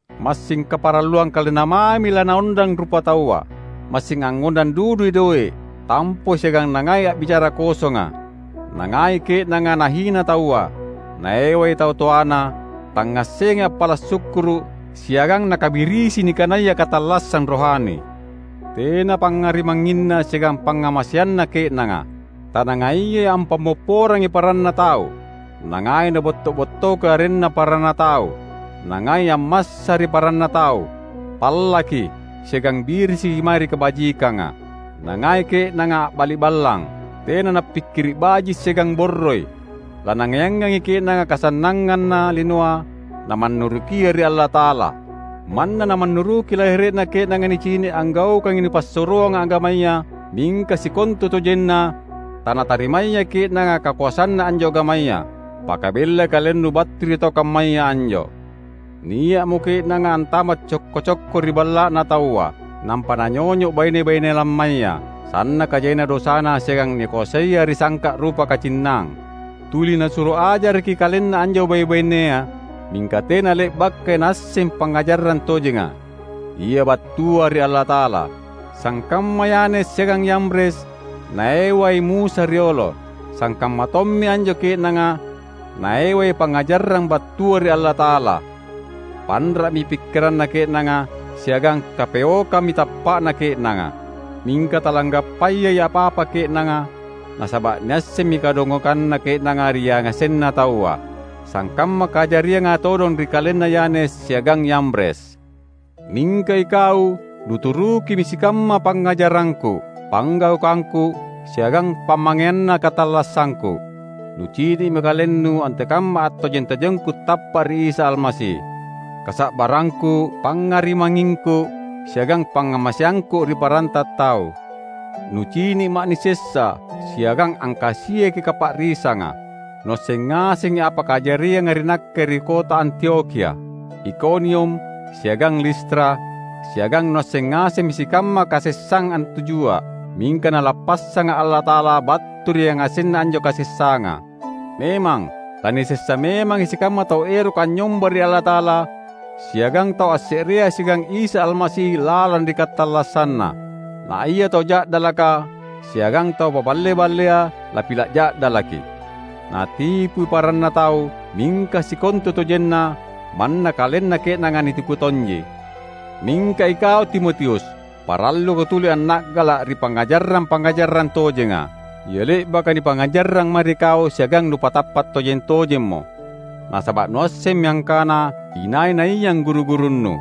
Massing kaparalluang kalenna mami lanaondang rupataua; massing angngondang dudui doe’, tampoi siagang nangai a’bicara kosonga. Nangai ke’nanga nahina taua, naewai tau toana, tangngassengai appala’ sukkuru’, siagang nakabirisi nikanaya katallassang rohani. Tena pangngarimangnginna siagang pangngamaseanna ke’nanga, tanangaiyai ampammopporangi paranna tau, nangai nabotto’-bottoki arenna paranna tau, nangai ammassa ri paranna tau, pallaki, siagang birisiki mae ri kabajikanga. Nangai ke’nanga a’bali’ballang, tena nappikkiri’ baji’ siagang borroi. Lanangaiangangi ke’nanga kasannanganna linoa namannurukia ri Allata’ala. Manna namannuruki lahere’na ke’nanga nicini’ anggaukangi napassuroanga agamaya, mingka sikontutojenna tanatarimayai ke’nanga kakoasanna anjo agamaya. Pakabellai kalennu battu ri tau kammaya anjo. Nia’mo ke’nanga antama’ cokko-cokko ri balla’na taua, nampa nanyonyo’ baine-baine lammaya, sannaka jaina dosana siagang nikoasaia ri sangka’ rupa kacinnang. Tuli nasuro ajaraki kalenna anjo bai’-bainea, mingka tena le’bakai naasseng pangngajarang tojenga, ia battua ri Allata’ala. Sangkamma Yanes siagang Yambres naewai Musa riolo, sangkamma tommi anjo ke’nanga naewai pangngajarang battua ri Allata’ala. Panra’mi pikkiranna ke’nanga, siagang kapeokammi tappa’na ke’nanga. Mingka talanggappayai apa-apa ke’nanga, nasaba’ niassemmi kadongokanna ke’nanga ri yangasenna taua, sangkamma kajarianga todong ri kalenna Yanes siagang Yambres. Mingka ikau nuturukimi sikamma pangngajarangku, panggaukangku, siagang pamangeanna katallassangku. Nucini’mi kalennu antekamma attojeng-tojengku tappa’ ri Isa Almasi, kasa’barrangku, pangngarimangngingku siagang pangngamaseangku ri paranta tau. Nucini’ma’ nisessa siagang angkasiaki kapa’risanga. Nuasseng ngasengi apa kajarianga ri nakke ri kota Antiokhia, Ikonium, siagang Listra; siagang nuasseng ngasengi sikamma kasessang antujua’! Mingka Nalappassanga’ Allata’ala battu ri yangasenna anjo kasessanga. Memang, lanisessa memangi sikamma tau eroka anynyomba ri Allata’ala siagang tau asse’rea siagang Isa Almasi lalang ri katallassanna; na ia tau ja’dalaka siagang tau paballe-ballea lapila’ ja’dalaki. Natipui paranna tau, mingka sikontutojenna manna kalenna ke’nanga nitipu tonji. Mingka ikau Timotius, paralluko tuli anna’gala’ ri pangngajarang-pangngajarang tojenga, ia le’baka nipangngajarrang mae ri kau siagang nupatappa’ tojeng-tojemmo; nasaba’ nuassemmi angkana inai-naiang guru-gurunnu.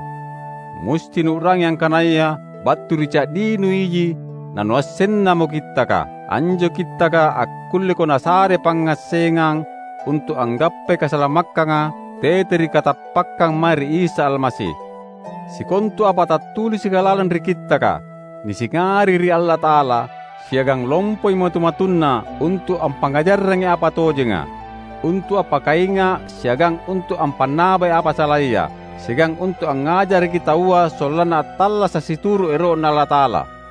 Musti nuu’rangi angkanaya battu ri ca’dinu iji nanuassennamo Kittaka. Anjo Kittaka akkulleko nasare pangngassengang untu’ anggappai kasalamakkanga tete ri katappakkang mae ri Isa Almasi. Sikontu apa tattulisika lalang ri Kittaka, nisingari ri Allata’ala, siagang lompoi matu-matunna untu’ ampangngajarrangi apa tojenga, untu’ appakainga’ siagang untu’ ampannabai apa salaya, siagang untu’ angngajaraki taua sollanna attallasa’ situru’ ero’Na Allata’ala.